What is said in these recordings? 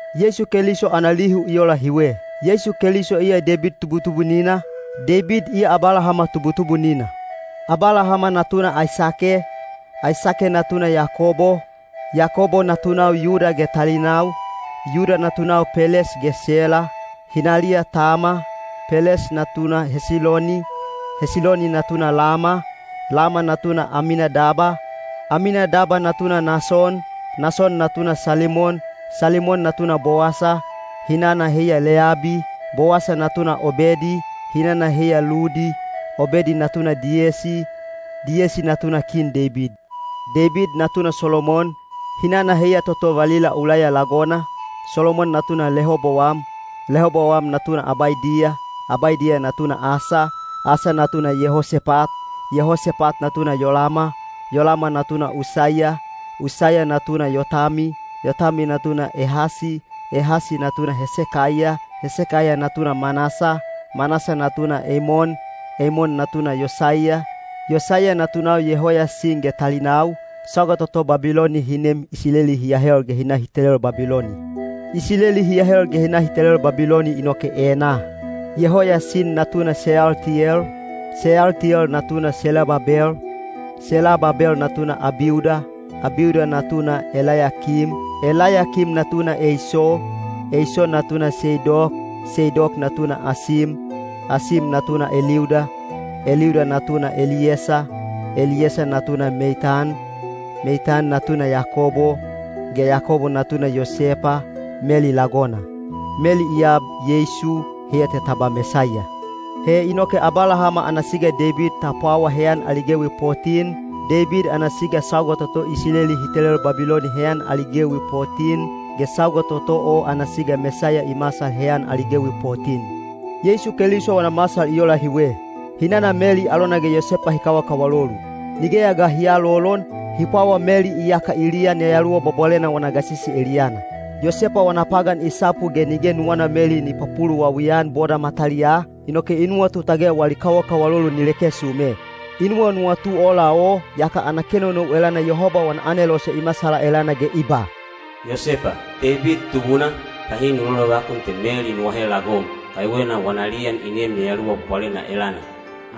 Yeisu Keliso ana lihu i ola hiwe. Yeisu Keliso iya Deibid tubutubunina, Deibid iya Abalahama tubutubunina. Abalahama natuna Aisake, Aisake natuna Yakobo, Yakobo natunau Yuda ge talinau, Yuda natunau Peles ge Sela, hinaliya Tama, Peles natuna Hesiloni, Hesiloni natuna Lama, Lama natuna Aminadab, Aminadab natuna Nason, Nason natuna Salimon, Salimon natuna Bowasa, hinana heiya Leyabi, Bowasa natuna Obedi, hinana heiya Ludi, Obedi natuna Diyesi, Diyesi natuna Kin Deibid. Deibid natuna Solomon, hinana heiya toto valila Ulaiya lagona, Solomon natuna Lehobowam, Lehobowam natuna Abaidiya, Abaidiya natuna Asa, Asa natuna Yehosepat, Yehosepat natuna Yolama, Yolama natuna Usaiya, Usaiya natuna Yotami, Yotami natuna Ehasi, Ehasi natuna Hesekaiya, Hesekaiya natuna Manasa, Manasa natuna Eimon, Eimon natuna Yosaiya, Yosaiya natunau Yehoyasin ge talinau, sauga toto Babiloni hi nem Isileli hi ahel ge hi na hi telel Babiloni. Isileli hi ahel ge hi na hi telel Babiloni inoke enaa: Yehoyasin natuna Seyaltiyel, Seyaltiyel natuna Selababel, Selababel natuna Abiuda, Abiuda natuna Elayakim, Elayakim natuna Eiso, Eiso natuna Seidok, Seidok natuna Akim, Asim natuna Eliuda, Eliuda natuna Eliyesa, Eliyesa natuna Meitan, Meitan natuna Yakobo, ge Yakobo natuna Yosepa, Meli lagona. Meli i ab Yeisu, heiya te ta ba Mesaiya. He inoke Abalahama ana siga Deibid ta pwawa heyan ali gewi potin, Deibid ana siga sauga toto Isileli hi telel Babiloni heyan ali gewi potin, ge sauga toto o ana siga Mesaiya i masal heyan ali gewi potin. Yeisu Keliso wana masal i ola hiwe. Hinana Meli alona ge Yosepa hi kawakawalolu. Nigeya ga hi aalolon, hi pwawa Meli iyaka i liyan Yayaluwa Bwabwalena wana gasisi eliyana. Yosepa wana pagan i sapu ge nige nuwana Meli ni papuluwawi-an boda mataliyaa, inoke i nuwatu tage wali kawakawalolu ni leke sume. I nuwanuwatu ola o, yaka ana kenonou elana Yehoba wana anelose i masala elana ge i ba, “Yosepa, Deibid tubuna, bahi nu lolovakun te Meli nu ahe lagom, kaiwena wana liyan i neem Yayaluwa Bwabwalena elana.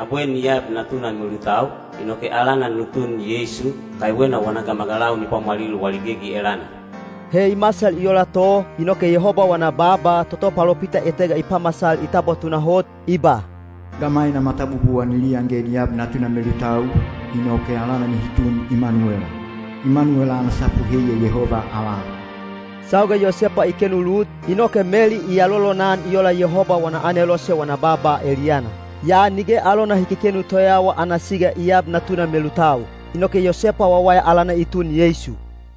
Abwe ni ab natuna melutau, inoke alana nu tun Yeisu, kaiwena wana gamagalau ni pwamwalil wali gegi elana.” He i masal i ola to, inoke Yehoba wana baaba toto palopita etega i pamasal i tabwa tunahot, i ba, “Gamaina matabubuwa ni liyan ge ni ab natuna melutau, inoke alana nihi tun Imanuwela.” Imanuwela ana sapu heiya “Yehoba avala.” Sauga Yosepa i kenu lut, inoke Meli i alolonan i ola Yehoba wana anelose wana baaba eliyana. Yaa nige alona hi kekenu toyawa ana siga i ab natuna melutau. Inoke Yosepa wawaya alana i tun Yeisu.